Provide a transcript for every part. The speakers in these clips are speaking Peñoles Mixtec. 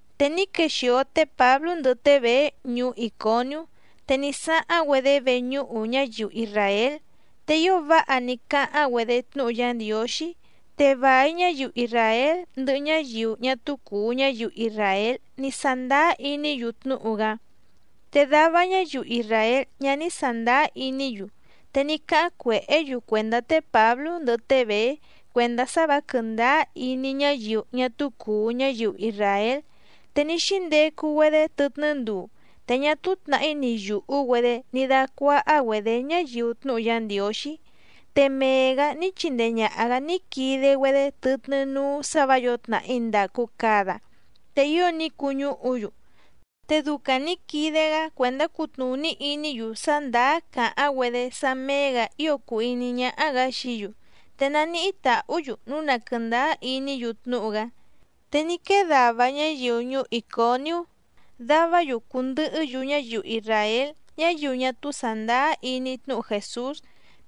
Te ní quexìo té Pǎblú ndɨhɨ té Bèé ñuú Ìconiú. Te ní sáháⁿ‑güedé veñúhu ñáyiu isràél, te ío váha ní cáháⁿ‑güedé tnúhu Yá Ndiǒxí, te vài ñáyiu isràél ndɨhɨ ñáyiu ñá túú cùu ñáyiu isràél ní sándáá iní‑yu tnúhu‑gá. Te dava ñáyiu isràél ñá ní sàndáá iní‑yu, te ní cáháⁿ cuèhé‑yu cuèndá té Pǎblú ndɨhɨ té Bèé cuèndá sá vǎ quɨ̀ndáá iní ñáyiu ñá túú cùu ñáyiu isràél. Te ní xíndecu‑güedé tɨtnɨ́ nduu, te ñá túú tnàhí ni yùhú‑güedé ní dácuáhá‑güedě ñáyiu tnúhu Yá Ndiǒxí. Te mee‑gǎ ní chindee ñàha‑gá ní quide‑güedé tɨtnɨ́ núú sǎ vǎ yǒo tnàhí ndàcu cada, te ío ní cuñúhu‑yu. Te ducaⁿ nǐ quide‑gá cuèndá cutnùní iní‑yu sá ndàá càháⁿ‑güedé sá méé‑gǎ ío cùu iní ñáhá‑gǎ xií‑yu, te naníhí tàhú‑yu núu na quɨ̀ndáá iní‑yu tnúhu‑gá. Te ní quee dava ñáyiu ñuú Ìconiú, davá‑yu cùndɨhɨ́‑yu ñáyiu isràél ñáyiu ñá túú sàndáá iní tnúhu Jèsús.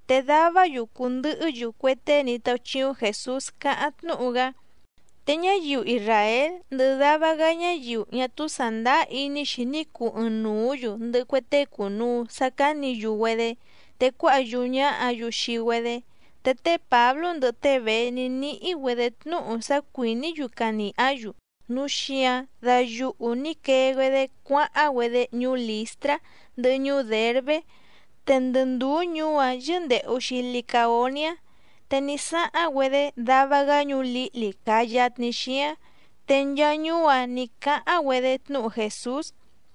Te davá‑yu cùndɨhɨ́‑yu cue tée ní táúchíúⁿ Jèsús càháⁿ tnúhu‑gá. Te ñáyiu isràél ndɨhɨ dava‑gá ñáyiu ñá túú sàndáá iní‑xi ní cuu ɨɨⁿnùú‑yu ndɨhɨ cue tée cùnuu sá cánǐ‑yu‑güedé, te cuáha yúú ñáhǎ‑yu xii‑güedé. Te té Pǎblú ndɨhɨ té Bèé ní níhí‑güedě tnúhu sá cuìní‑yu canìhá‑yu, núu xíǎⁿ dayuhu nǐ quee‑güedé cuáháⁿ‑güedé ñuú Lìstrá ndɨhɨ ñuú Dèrbé. Te ndɨ ndùú ñuú‑áⁿ yɨ́ndèhu‑xi Licaoniá. Te ní sáháⁿ‑güedé dava‑gá ñuú lǐhli càa yatni xíáⁿ. Te nchaa ñuú‑áⁿ nǐ cáháⁿ‑güedé tnúhu Jèsús.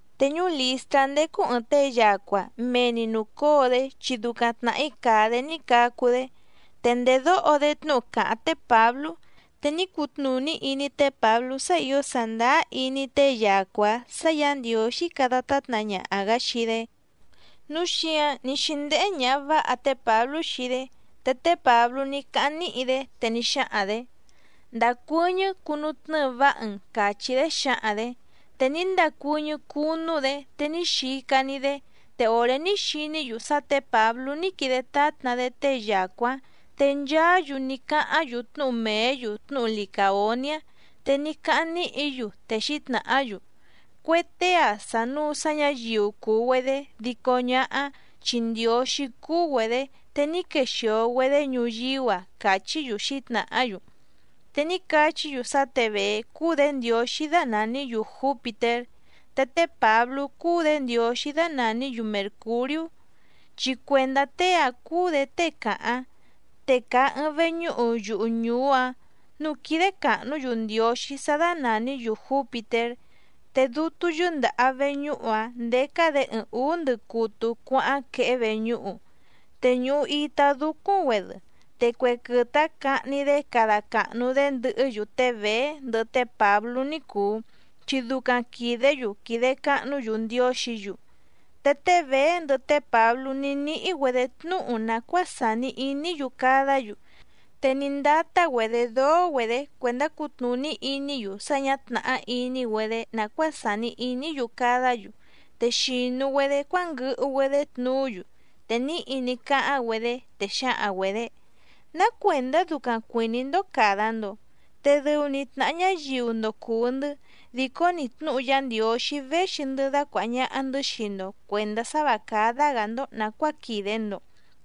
Te ñuú Lìstrá ndécú ɨ̀ɨⁿ tée yacua, mee‑ni nùcóo‑dé chi ducaⁿ tnàhí càa‑dé ní cacu‑dé. Te ndèdóho‑dé tnúhu càháⁿ té Pǎblú, te ní cutnùní iní té Pǎblú sá ǐo sàndáá iní tée yacua‑ǎⁿ sǎ Yǎ Ndiǒxí cada tátna ñaha‑gǎ xii‑dé, núu xíǎⁿ ní xíndéhé ñàha váha té Pǎblú xii‑dé. Te té Pǎblú ní cáháⁿ níhi‑dé, te ní xáhaⁿ‑dě: —Ndacuɨ́ñɨ́ cunutnɨ́ɨ váha‑n —càchí‑dé xǎhaⁿ‑dě. Te ní ndacuɨ́ñɨ́ cunu‑dé te ní xica‑ni‑dé. Te òré ní xiní‑yu sá tě Pǎblú ní quide tátna‑dé tée yacua‑ǎⁿ, te nchaá‑yu ní cáháⁿ‑yu tnúhu mèé‑yu tnúhu Licàoniá. Te ní cáháⁿ níhi‑yu, te xǐtnàhá‑yu: —Cue tée‑ǎⁿ sànuu sá ñǎyiu cùu‑güedé dico ñáhá, chi ndiǒxí cúú‑güedě te ní quexìo‑güedé ñuyíú‑a —càchí‑yu xǐtnàhá‑yu. Te ní cachí‑yu sá tě Bèé cúú‑dě ndiǒxí dánàní‑yu Jǔpitér, te té Pǎblú cúú‑dě ndiǒxí dánàní‑yu Mèrcuriú, chi cuèndá tée‑áⁿ cúú‑dě tée càháⁿ. Te càa ɨɨⁿ veñúhu yuhu ñùú‑áⁿ núú quídé càhnú‑yu ndiǒxí sá dánàní‑yu Jǔpitér. Te dútú yɨ́ndàha veñúhu‑áⁿ ndécá‑dě ɨɨⁿ ǔú ndɨcutu cuáháⁿ quehé veñúhu, te ñùhu itá dúcúⁿ‑güedɨ. Te cue quɨtɨ‑áⁿ cahni‑dé cada càhnu‑dé ndɨhɨ́‑yu té Bèé ndɨhɨ té Pǎblú ní cùu, chi ducaⁿ quìdé‑yu quìde cahnú‑yu ndiǒxǐ‑yu. Te té Bèé ndɨhɨ té Pǎblú ní níhí‑güedě tnúhu nàcuáa sàni iní‑yu cadá‑yu, te ní ndátá‑güedě dóó‑güedě cuèndá cutnùní iní‑yu sá ñǎ tnàhá iní‑güedé nàcuáa sàni iní‑yu cadá‑yu. Te xìnu‑güedé cuánguɨhu‑güedé tnuú‑yu, te níhi ní cáháⁿ‑güedé, te xǎhaⁿ‑güedě: —¿Ná cuèndá ducaⁿ cuìní‑ndó càda‑ndo? Te dɨu‑ni tnàha ñáyiu‑ndo cùu‑ndɨ́, dìcó‑ni tnúhu Yá Ndiǒxí véxi‑ndɨ́ dacuàha ñaha‑ndɨ́ xii‑ndo cuèndá sá vǎ cádá‑gǎ‑ndó nàcuáa quìde‑ndo,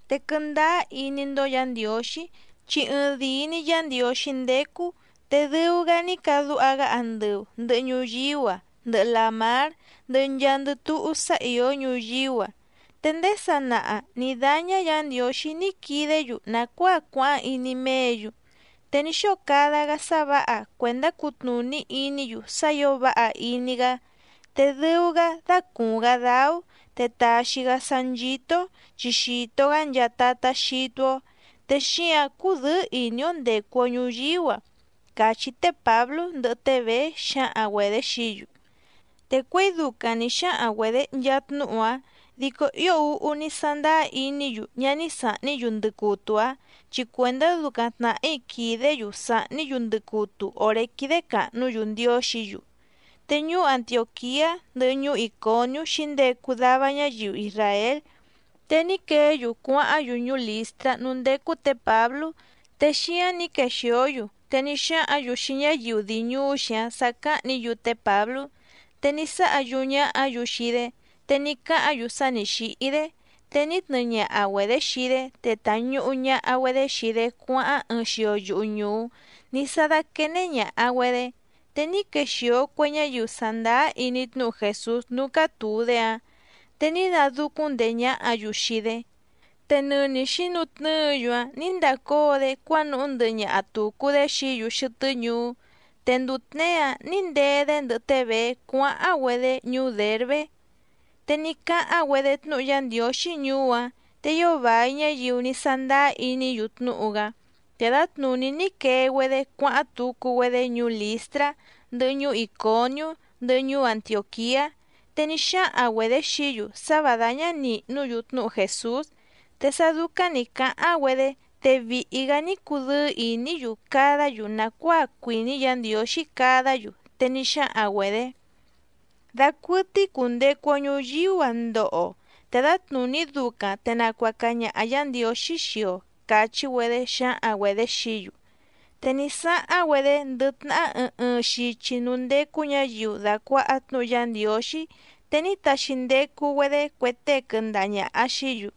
te quɨndáá iní‑ndó Yǎ Ndiǒxí, chi ɨɨⁿdìi‑ni Yá Ndiǒxí ndécú. Te dɨu‑gá ní cadúha‑gá andɨu ndɨ̀hɨ ñuyíú‑a ndɨhɨ làmár ndɨhɨ nchaandɨ túhú sá ìó ñuyíú‑a. Te ndéé sanaha nǐ dáñá Yǎ Ndiǒxí ní quidé‑yu nàcuáa cuáháⁿ iní méě‑yu. Te ní xóo cada‑gá sá vǎha cuèndá cutnùní iní‑yu sá ǐo váha iní‑gá. Te dɨu‑gá dácùuⁿ‑gá dáú, te tàxi‑gá sá nchító‑ó chi xìto‑gá nchaa tatá xítú‑ó, te xíǎⁿ cúdɨ̌ɨ́ ìní‑ó ndècu‑o ñuyíú‑a —càchí té Pǎblú ndɨhɨ té Bèé xǎhaⁿ‑güedě xií‑yu. Te cuěi ducaⁿ nǐ xáhaⁿ‑güedě nchaa tnúhu‑áⁿ, dico ío úhú ní sándáá iní‑yu ñá ní sàhní‑yu ndɨcutu‑áⁿ chi cuèndá ducaⁿ tnàhí quìdé‑yu sàhní‑yu ndɨcutu òré quídé càhnú‑yu ndiǒxǐ‑yu. Te ñuú Antiòquiá ndɨhɨ ñuú Ìconiú xǐndecu dava ñáyiu isràél, te ní queé‑yu cuáháⁿ‑yu ñuú Lìstrá núú ndécú tě Pǎblú. Te xíáⁿ nǐ quexìó‑yu te ní xáhǎⁿ‑yu xii ñáyiu dii ñùú xíáⁿ sǎ cáhnǐ‑yu té Pǎblú. Te ní sáha yúú ñáhǎ‑yu xii‑dé, te ní cáhǎⁿ‑yu sá nǐ xíhí‑dé, te ní tnɨɨ ñaha‑güedě xii‑dé, te tàñuhu ñaha‑güedé xii‑dé cuáháⁿ ɨɨⁿ xio yuhu ñùú ní sá dáquéné ñàha‑güedé. Te ní quexìo cue ñáyiu sàndáá iní tnúhu Jèsús núú cátùu‑dé‑áⁿ, te ní nadúcúⁿ ndèé ñáhǎ‑yu xii‑dé, te nɨni xǐnutnɨ́ɨ‑yu‑áⁿ nǐ ndacóo‑dé cuánuhú ndɨhɨ ñaha tùcu‑dé xií‑yu xɨtɨ́ ñuú. Te nduu tněé‑áⁿ nǐ ndee‑dé ndɨhɨ té Bèé cuáháⁿ‑güedé ñuú Dèrbé. Te ní cáháⁿ‑güedé tnúhu Yá Ndiǒxí ñuú‑áⁿ, te ío vài ñáyiu ní sándáá iní‑yu tnúhu‑gá. Te dǎtnùní ní quee‑güedé cuáháⁿ tucu‑güedé ñuú Lìstrá, ndɨhɨ ñuú Ìconiú, ndɨhɨ ñuú Antiòquiá. Te ní xáhaⁿ‑güedě xií‑yu sá vǎ dáñá nìhnú‑yu tnúhu Jèsús. Te sá dúcáⁿ nǐ cáháⁿ‑güedé, te vìhi‑gá ní cudɨ́ɨ́ ìní‑yu cadá‑yu nàcuáa cuìní Yǎ Ndiǒxí cadá‑yu, te ní xáhaⁿ‑güedě: —Dacuɨtɨ́í cùndecu‑o ñuyíú‑a ndoho‑o, te dǎtnùní ducaⁿ te nacuaca ñaha Yǎ Ndiǒxí xii‑o —càchí‑güedé xǎhaⁿ‑güedě xií‑yu. Te ní sáháⁿ‑güedé ndɨ tnahá ɨɨⁿ ɨɨⁿ xichi núú ndécú ñǎyiu dàcuaha tnúhu Yá Ndiǒxí, te ní taxi ndecu‑güedé cue tée quɨndaha ñàha xií‑yu,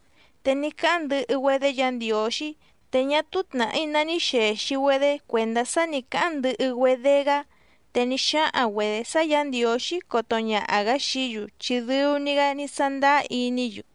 te ní cáháⁿ ndɨhɨ‑güedé Yǎ Ndiǒxí, te ñá túú tnàhí ná ní xèxi‑güedé cuèndá sá nǐ cáháⁿ ndɨhɨ‑güedé‑gá. Te ní xáhaⁿ‑güedě sá Yǎ Ndiǒxí coto ñaha‑gǎ xií‑yu chi dɨu‑ni‑gá ní sándáá iní‑yu.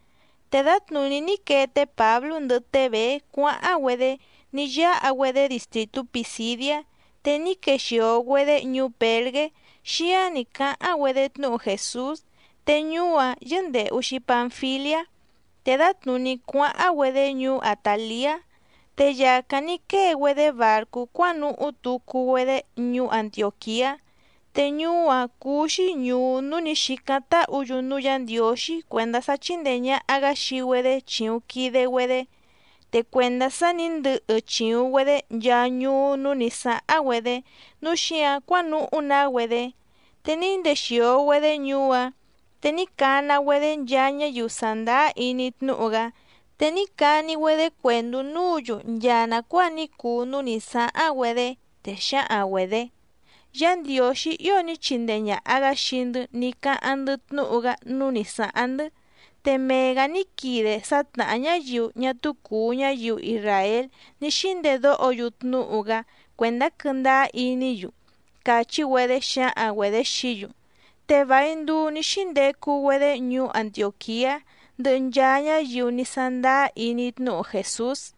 Te dǎtnùní ní quee té Pǎblú ndɨhɨ té Bèé cuáháⁿ‑güedé, ní yáha‑güedé distrìtú Pìsidiá. Te ní quexìo‑güedé ñuú Pèrgé, xíáⁿ nǐ cáháⁿ‑güedé tnúhu Jèsús. Te ñuú‑áⁿ yɨ́ndèhu‑xi Panfiliá. Te dǎtnùní cuáháⁿ‑güedé ñuú Àtaliá. Te yàcáⁿ ní quée‑güedé bàrcú cuánuhú tucu‑güedé ñuú Antiòquiá. Te ñuú‑áⁿ cúú‑xí ñùú núú nǐ xícáⁿ táhǔ‑yu núú Yǎ Ndiǒxí cuèndá sá chíndèe ñaha‑gá xii‑güedé chìuⁿ quide‑güedé. Te cuèndá sá nǐ ndɨhɨ chìuⁿ‑güedé nchaa ñuú núú nǐ sáháⁿ‑güedé, núu xíǎⁿ cuánuhú‑na‑güedé. Te ní ndexìo‑güedé ñuú‑áⁿ, te ní cana‑güedé nchaa ñáyiu sàndáá iní tnúhu‑gá, te ní cani‑güedé cuèndú núǔ‑yu nchaa nàcuáa ní cuu núú nǐ sáháⁿ‑güedé, te xǎhaⁿ‑güedě: “Yá Ndiǒxí ío ní chindee ñàha‑gá xii‑ndɨ́ ní cáháⁿ‑ndɨ́ tnúhu‑gá núú nǐ sáháⁿ‑ndɨ́, te mee‑gǎ ní quide sá tnàhá ñáyiu ñá túú cùu ñáyiu isràél ní xíndedóho‑yu tnúhu‑gá cuèndá quɨ́ndáá iní‑yu”, càchí‑güedé xǎhaⁿ‑güedě xií‑yu. Te vài nduu ní xíndecu‑güedé ñuú Antiòquiá ndɨhɨ nchaa ñáyiu ní sándáá iní tnúhu Jèsús.